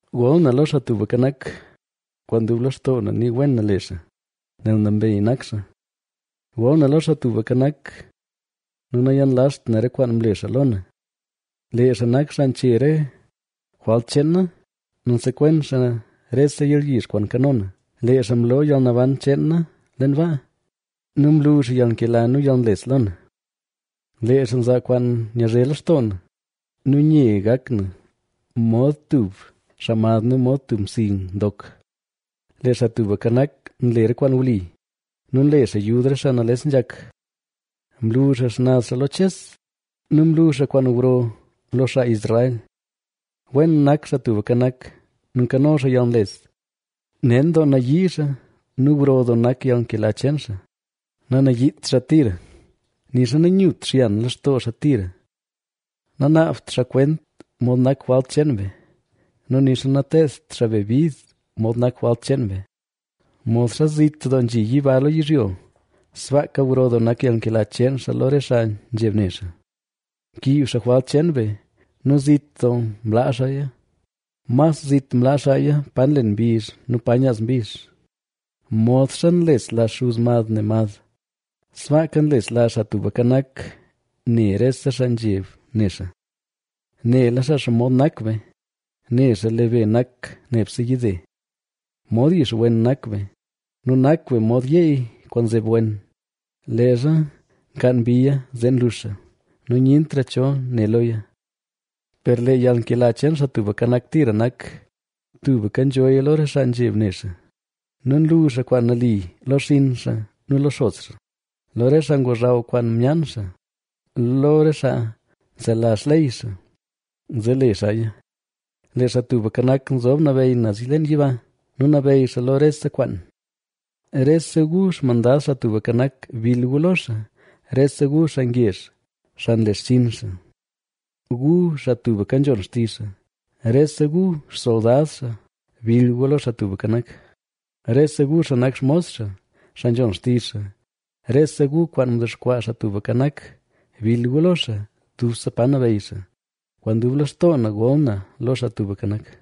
Gol na lo Xaa Tubka Nak, kwaan dub lextoo na ni wen na le xaa, nel nambey nak xaa. Gol na lo Xaa Tubka Nak nu nayenlazht na re kwaan mle xaa lo na. Lee xaa nak xaa nche re jwalt cheen na nu nsekwen xaa rese yalyizh kwaan nkano na, lee xaa mloo yalnaban cheen na leen baa nu mlu xaa yalnkela nu yalnles lo na, lee xaa nzaa kwaan nyazhe lextoo na nu nye gak na mod tub xaa mad nu mod tub msi ndok. Lee Xaa Tubka Nak nle re kwaan wli nu nle xaa yud re xaa nales nzhak. Mlu xaa xnaz xaa lo Ches nu mlu xaa kwaan gro lo xaa Israel. Wen nak Xaa Tubka Nak, nu nkano xaa yalnles; nen doo nayii xaa nu gro doo nak yalnkela cheen xaa. Nanayiit xaa tira, nixa nanyut xyan lextoo xaa tira. Nanaabt xaa kwent mod nak jwalt cheen be nu nixa nateedt xaa be bid mod nak jwalt cheen be. Modxa zit doo nzhi yiba lo yizhyo, sbaaka gro doo nak yalnkela cheen xaa lo re xaa nzheb ne xaa. Mkiib xaa jwalt cheen be nu zit doo mlaa xaaya, mas zit mlaa xaaya pa nlen mbizh nu pa nyaaz mbizh. Modxa nlesla xuz mad ne mad, sbaaka nlesla Xaa Tubka Nak, ne rese xaa nzheb ne xaa. Nela xaa xomod nak be; ne xaa lee be nak nebse yide. Mod yixwen nak be nu nak be mod yeey kwaan nzeb wen; leezha nkaan mbiya zee nluxa nu nyentra cho ne loya. Per lee yalnkela cheen Xaa Tubka Nak, tira nak, tubka nzhoya lo re xaa nzheb ne xaa, nu nlu xaa kwaan nali lo xinn xaa nu lo xos xaa, lo re xaa ngozhaw kwaan myaan xaa, lo re xaa nselazh xley xaa, zee le xaaya. Lee Xaa Tubka Nak, nzob nabeyy naz leen yiba nu nabeyy xaa lo rese kwaan. Rese gu xmandad Xaa Tubka Nak, bill gu lo xaa, rese gu xaa ngezh, xaa nle xchinn xaa, gu xaa tubka nzhon xtizh xaa. Rese gu xsoldad xaa bil gu lo Xaa Tubka Nak, rese gu xaa nak xmos xaa, xaa nzhon xtizh xaa. Rese gu kwaan mdexkwaa Xaa Tubka Nak, bill gu lo xaa, dubse pa nabeyy xaa. ¡Kwaan dub lextoo na gol na lo Xaa Tubka Nak!